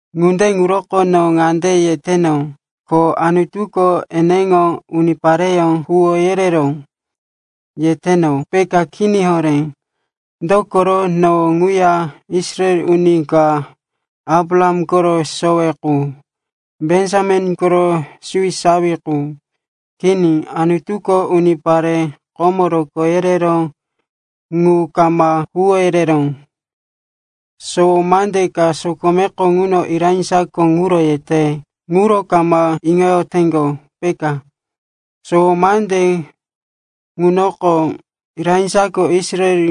Ŋunde ŋuroko no ŋande yeteno, “Ko Anutuko eneŋo unipareyó huwó yereró,” yeteno, peka? Kini horé. Dokoro no ŋuya Israel uni ka, Abraham koro sowe qu, Benjamin koro suwisawi qu. Kini, Anutuko unipare komo rokó yereró ŋu kama huwó yereró. Sowo mande ka sokomeko ŋuno Elaija ŋuro yete. Ŋuro kama iŋoyoteŋgo, peka. Sowo mande ŋunoko Elaijako Israel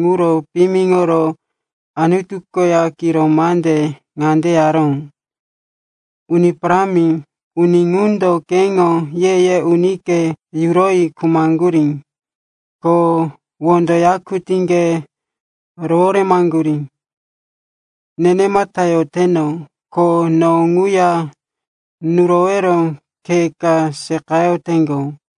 ŋuro piyimiŋoro Anutu koya kiro mande ŋande yaró, “Uni Parámi, uni ŋundo keŋo ye-ye unike yuroyi khumaŋgurí ko wondo yakutíŋge roworemaŋgurí. Nenemata yoteno, ko no ŋuya nurowero khe ka seqayoteŋgo.”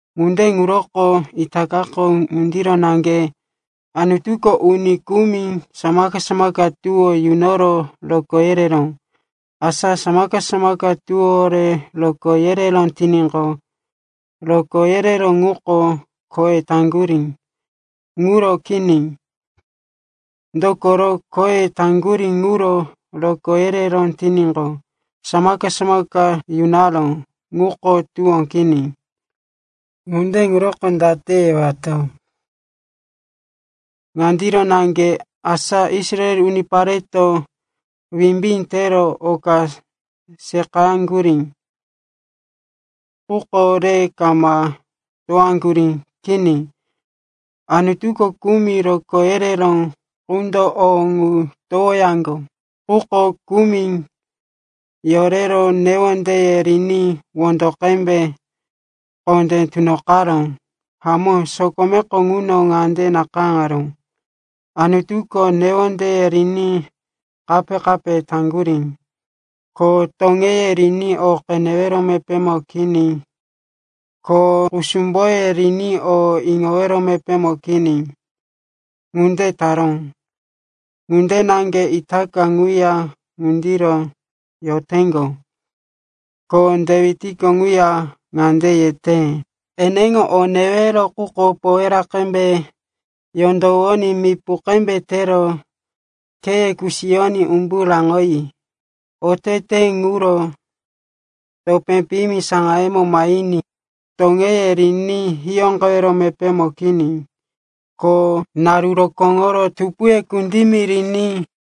Ŋunde ŋuroko itakako ŋundiro naŋge. Anutuko uni kumi samaka-samaka tuwó yunoro rokó yereró. Asa samaka-samaka tuwówore rokó yereró tiníqo, rokó yereró ŋuko khoye taŋgurí ŋuro kini. Dokoro khoye taŋgurí ŋuro rokó yereró tiníqo, samaka-samaka yunaró ŋuko tuwó kini. Ŋunde ŋuroko date yewato? Ŋandiro naŋge, asa Israel unipareto wimbí tero oka seqayaŋgurí, quko re kama towaŋgurí. Kini, Anutuko kumi rokó yereró qundo o ŋu towoyaŋgo. Quko kumi yorero newondeye riní wondo qembe kondé tunoqaró. Hamó, sokomeko ŋuno ŋande nakayáŋaró, “Anutuko newondeye riní kape-kape taŋgurí, ko toŋeye riní o qenewero mepémo kini, ko kusumboye riní o iŋowero mepémo kini. Ŋunde taró ŋunde naŋge itaka ŋuya ŋundiro yoteŋgo.” Ko Dewitko ŋuya ŋande yete, “Eneŋo o newero quko powera ŋunde qembe yondowoní mipu qembe tero kheye kusiyoní umbu raŋoyi, otete ŋuro topé piyimi saŋayemo mahiní. Toŋeye riní hiyóqewero mepémo kini ko naru rokóŋoro tupuye kundimi riní.”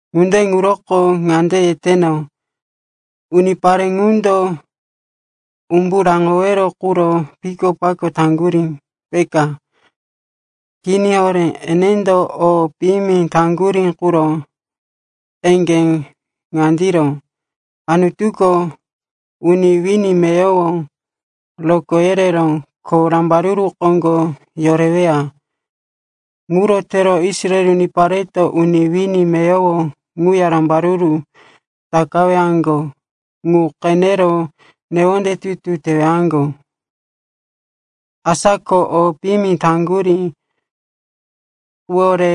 Ŋunde ŋuroko ŋande yeteno, unipare ŋundo umbu raŋowero quro pikopako taŋgurí, peka? Kini horé. Enendo o piyimi taŋgurí quro eŋgé ŋandiro, Anutuko uni wini meyowo rokó yereró, ko rambaruru koŋgo yoreweya. Ŋuro tero Israel unipareto uni wini meyowo ŋuya rambaruru takawaŋgo ŋu qenero newonde tutu tewaŋgo. Asa ko o piyimi taŋgurí quwore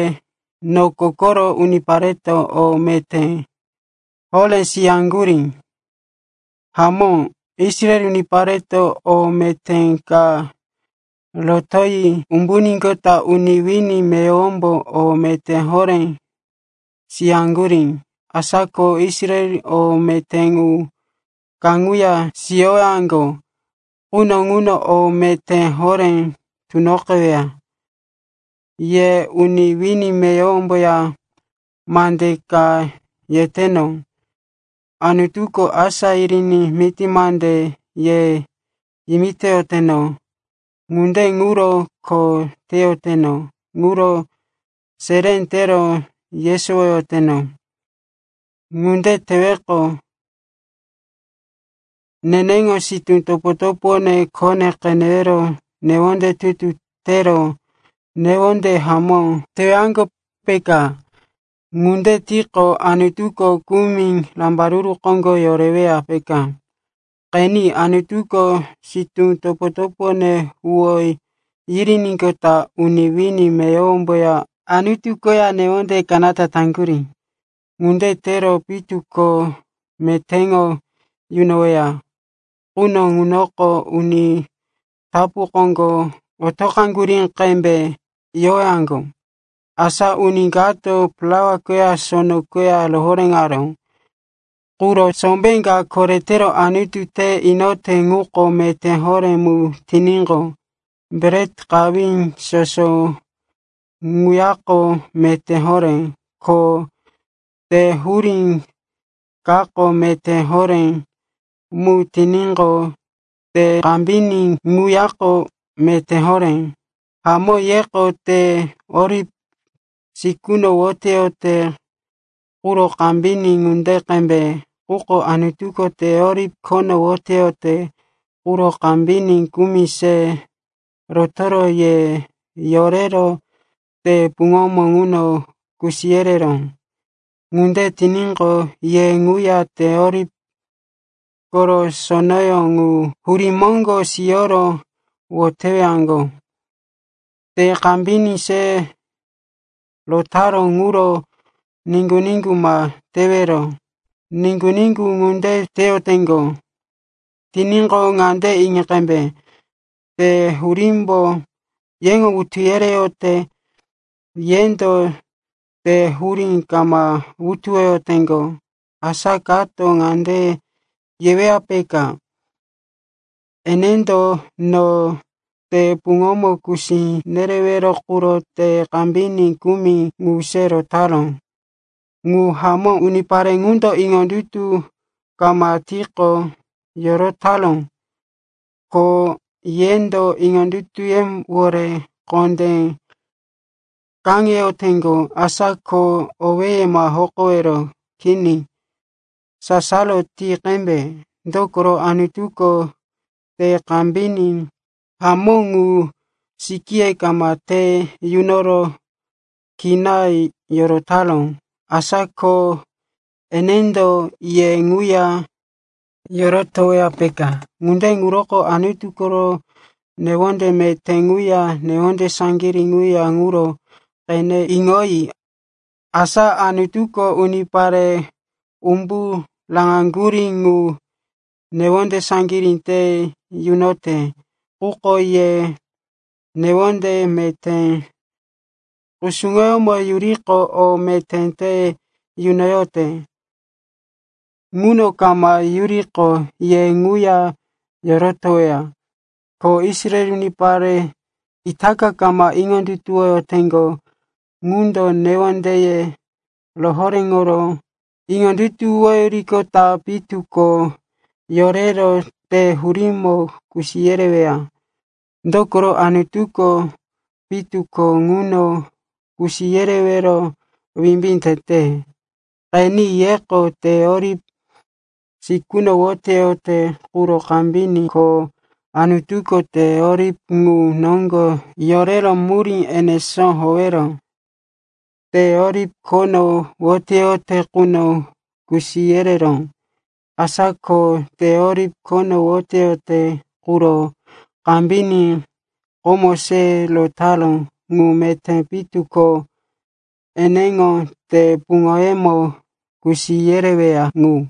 noko koro unipareto o meté horé siyaŋgurí. Hamó, Israel unipareto o meté ka rotoyi umbuníqota uni wini meyowombo o meté horé siyaŋgurí. Asa ko Israel o meté ŋu kaŋuya siyowaŋgo quno ŋuno o meté horé tunoqeweya. Ye uni wini meyowomboya mande ŋa yeteno. Anutuko asá niriní miti mande ye yimitoyoteno. Ŋunde ŋuro kho teyoteno ŋuro seré tero yesowoyoteno. Ŋunde teweqo, neneŋo sitú topo-topone khone qenero newonde tutu tero newonde hamó tewaŋgo, peka. Ŋunde tiqo, Anutuko kumi rambaruru koŋgo yoreweya, peka. Qeni, Anutuko sitú topo-topone huwó yiriníqota uni wini meyowomboya Anutu koya newonde kanata taŋgurí. Ŋunde tero pitu ko metéŋo yunoweya quno ŋunoko uni tapu koŋgo otoqaŋgurí qembe yowaŋgo. Asa uni kato plaua koya sono koya rohoréŋaró quro sombé ka koretero Anutu te inote ŋuko meté horé mu tiníqo, bret qawí soso ŋuyako meté horé. Ko te hurí kako meté horé mu tiníqo, te kambiní ŋuyako meté horé. Hamó, yeko te oliv sikuno woteyote quro kambiní ŋunde qembe. Quko Anutuko te oliv khono woteyote quro kambiní kumi se rotoro ye yorero te puŋomo ŋuno kusi yereró. Ŋunde tiníqo, ye ŋuya te oliv koro sonoyó ŋu hurí moŋgo siyoro wotewaŋgo. Te kambiní se rotaró ŋuro niŋgu-niŋgu ma tewero. Niŋgu-niŋgu ŋunde teyoteŋgo tiníqo, ŋande iŋi qembe, te hurímbo yeŋo wutu yereyote, yendo te hurí kama wutuwoyoteŋgo. Asa kato ŋande yeweya, peka, “Enendo no te puŋomo kusi nerewero quro te kambiní kumi ŋu se rotaró.” Ŋu hamó. Unipare ŋundo iŋondutu kama tiqo yorotaró. Ko yendo iŋondutuyewore kondé kaŋeyoteŋgo. Asa ko owéye ma hokowero. Kini, sasaro ti qembe. Dokoro Anutuko te kambiní hamó ŋu sikíye kama te yunoro kina yorotaró. Asa ko enendo ye ŋuya yorotoweya, peka. Ŋunde ŋuroko Anutu koro newonde meté ŋuya newonde saŋgirí ŋuya ŋuro qene iŋoyi. Asa Anutuko unipare umbu raŋaŋgurí ŋu newonde saŋgirí te yunote. Quko ye newonde meté kusuŋoyómo yuriqo, o meté te yunoyote. Ŋuno kama yuriqo, ye ŋuya yorotoweya. Ko Israel unipare itaka kama iŋondutuwoyoteŋgo ŋundo newondeye rohoréŋoro iŋondutuwoyiqota pitu ko yorero te hurímo kusi yereweya. Dokoro Anutuko pitu ko ŋuno kusi yerewero wimbí tete. Qeni, yeko te oliv sikuno woteyote quro kambiní, ko Anutuko te oliv ŋu noŋgo yorero murí enesó howero te oliv khono woteyote quno kusi yereró. Asa ko te oliv khono woteyote quro kambiní komo se rotaró ŋu meté pitu ko eneŋo te puŋoyemo kusi yereweya ŋu.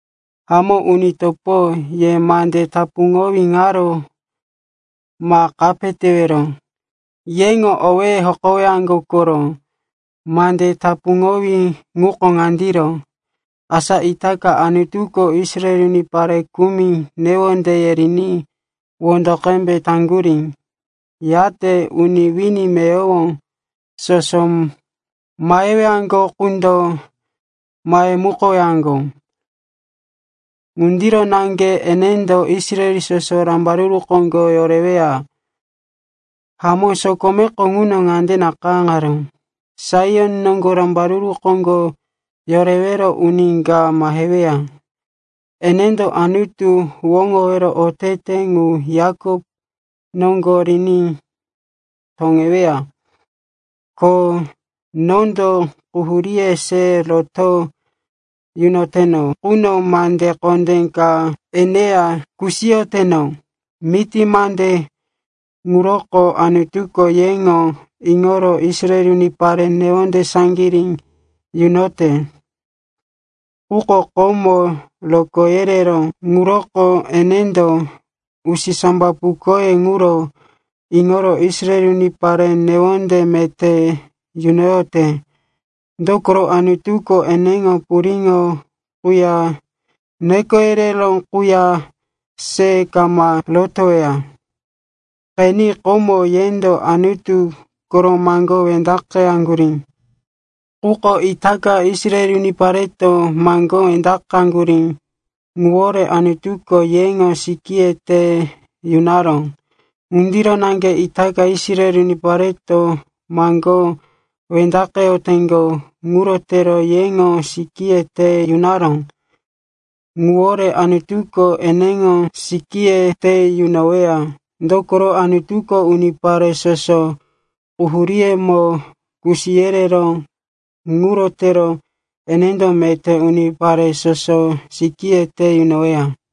Hamó, uni topo, ye mande tapuŋowí ŋaro ma kape tewero. Yeŋo owéye hokowaŋgo koro. Mande tapuŋowí ŋuko ŋandiro, asa itaka Anutuko Israel unipare kumi newondeye riní wondo qembe taŋgurí, yate uni wini meyowo soso mahewaŋgo qundo mahemukowaŋgo. Ŋundiro naŋge enendo Israel soso rambaruru koŋgo yoreweya. Hamó, sokomeko ŋuno ŋande nakayáŋaró, “Saion noŋgo rambaruru koŋgo yorewero uni ka maheweya. Enendo Anutu huwóŋowero otete ŋu Yakop noŋgo riní toŋeweya. Ko nondo quhuríye se roto yunoteno quno mande kondé ŋa eneya kusiyoteno.” Miti mande ŋuroko Anutuko yeŋo iŋoro Israel unipare newonde saŋgirí yunoyote. Quko komo rokó yereró ŋuroko enendo usisambapukoye ŋuro iŋoro Israel unipare newonde meté yunoyote. Dokoro Anutuko eneŋo puriŋo quya neko yereró quya se kama rotoweya. Qeni, komo yendo Anutu koro maŋgó wendaqeyaŋgurí. Quko itaka Israel unipareto maŋgó wendaqaŋgurí ŋuwore Anutuko yeŋo sikíye te yunaró. Ŋundiro naŋge itaka Israel unipareto maŋgó wendaqeyoteŋgo. Ŋuro tero yeŋo sikíye te yunaró ŋuwore Anutuko eneŋo sikíye te yunoweya. Dokoro Anutuko unipare soso quhuríyemo kusi yereró. Ŋuro tero enendo meté unipare soso sikíye te yunoweya.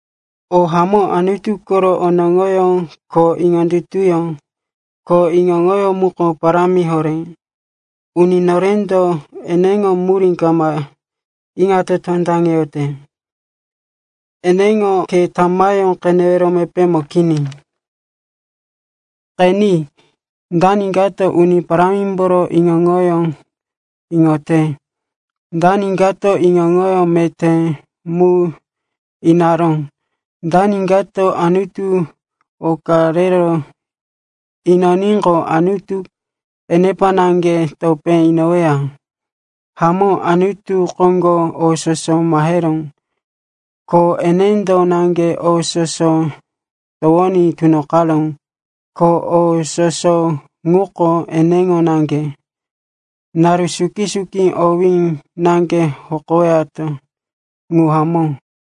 O hamó! Anutu koro onoŋoyó ko iŋondutuyó ko iŋo-iŋoyó muko parámi horé. Uni norendo eneŋo murí kama iŋato tondaŋeyote, eneŋo khe tamayó qenewero mepémo kini. “Qeni, dani kato Uni Parámimboro iŋo-iŋoyó iŋote? Dani kato iŋo-iŋo meté mu inaró?” “Dani kato Anutu oka rero inoníqo Anutu enepa naŋge topé inoweya?” Hamó, Anutu koŋgo o soso maheró, ko enendo naŋge o soso towoní tunoqaró, ko o soso ŋuko eneŋo naŋge. Naru suki-suki owí naŋge hokoyowato. Ŋu hamó.